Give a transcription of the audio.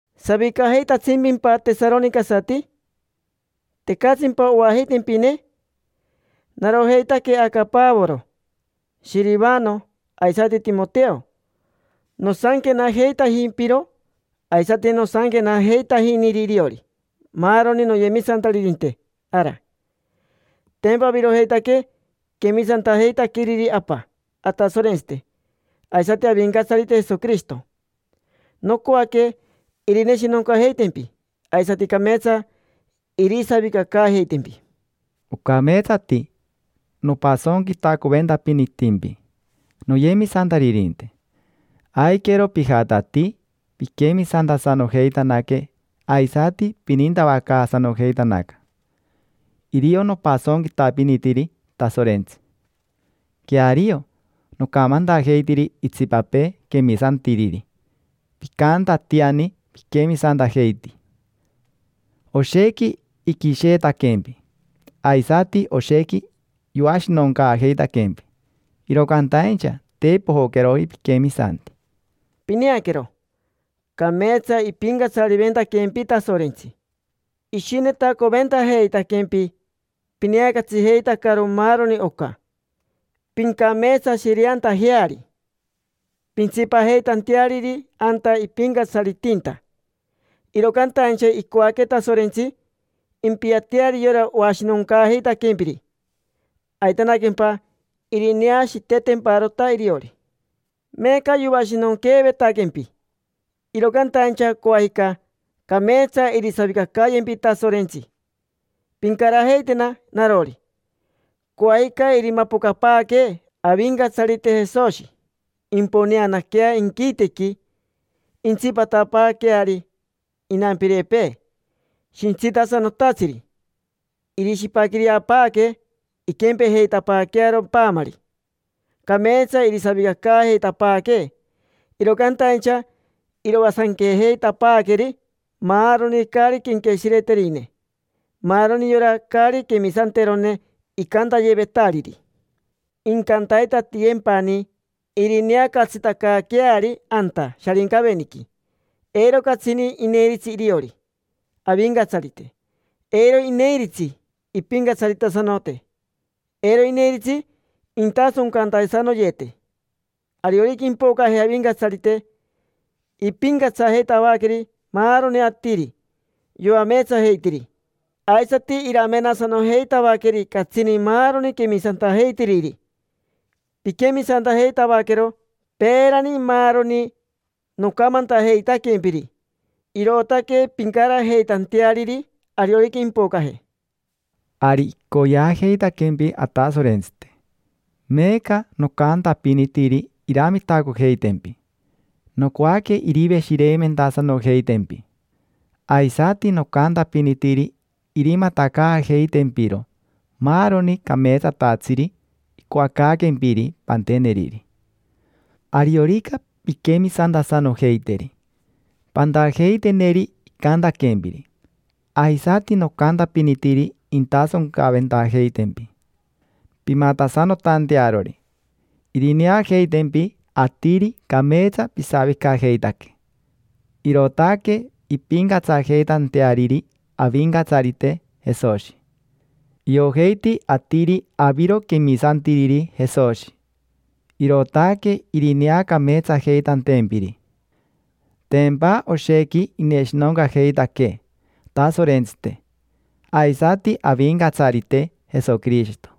¿Savicajeitatsimpimpa, tesaronicasati? ¿Tecatsimpa oajeitempine? Narojeitaque aca Pavoro, Shirivano, aisati Timoteo; nosanquenajeitajimpiro, aisati nosanquenajeitajiniri iriori maaroni noyemisantaririnte ara. Tempa avirojeitaque quemisantajeitaqueriri Apa Atasorentsite aisati Avincatsarite Jesoquirishito. Nocoaque irineshinoncajeitempi aisati cameetsa irisavicacaajeitempi. Ocameetsati nopasonquitacoventapinitimpi, noyemisantaririnte. Aiquero pijatatii piquemisantasanojeitanaque aisati pinintavacaasanojeitanaca. Irio nopasonquitapinitiri Tasorentsi. Queario, nocamantajeitiri itsipapee quemisantiriri picantatiani piquemisantajeiti. Oshequi iquisheetaquempi, aisati oshequi yoashinoncaajeitaquempi, iro cantaincha te pojoqueroji piquemisanti. Pineaquero, cameetsa ipincatsariventaquempi Tasorentsi. Ishinetacoventajeitaquempi pineacatsijeitacaro maaroni oca, pincameetsashireantajeari, pintsipajeitanteariri anta ipincatsaritinta. Iro cantaincha icoaque Tasorentsi impiateari yora oashinoncaajeitaquempiri, aitanaquempa irineashiitetemparota iriori. Meeca yoashinonqueevetaquempi, iro cantaincha coajica cameetsa irisavicacayempi Tasorentsi, pincarajeitena narori. Coajica irimapocapaaquee Avincatsarite Jesoshi, imponeanaquea inquitequi, intsipatapaaqueari inampirepee shintsitasanotatsiri. Irishipaquireapaaque, inquempejeitapaaquearo paamari. Cameetsa irisavicacaajeitapaaquee, iro cantaincha iroasanquejeitapaaqueri maaroni caari quenqueshireterine: maaroni yora caari quemisanterone icantayevetariri. Incantaitatiyempani irineacatsitacaaqueari anta Sharincaveniqui, eiro catsini ineiritsi iriori Avincatsarite. Eiro ineiritsi impincatsaritasanote, eiro ineiritsi intasoncantasanoyete. Ariorica impocaje Avincatsarite, impincatsajeitavaqueri maaroni atiri yoameetsajeitiri, aisati iramenasanojeitavaqueri catsini maaroni quemisantajeitiriri. Piquemisantajeitavaquero peerani maaroni nocamantajeitaquempiri, irootaque pincarajeitanteariri ariorica impocaje. Ari icoyeajeitaquempi Atasorentsite, meeca nocantapinitiri iramitacojeitempi, nocoaque iriveshireimentasanojeitempi. Aisati nocantapinitiri irimatacaajeitempiro maaroni cameetsatatsiri icoacaaquempiri panteneriri. Ariorica pinquemisantasanojeiteri, pantajeiteneri icantaquempiri; aisati nocantapinitiri intasoncaventajeitempi pimatasanotantearori. Irineajeitempi atiri cameetsa pisavicajeitaque, irootaque impincatsajeitanteariri Avincatsarite Jesoshi. Iojeiti atiri aviro quemisantiriri Jesoshi, irootaque irineacameetsajeitantempiri. Tempa oshequi ineshinoncajeitaquee Atasorentsite, aisati Avincatsarite Jesoquirishito.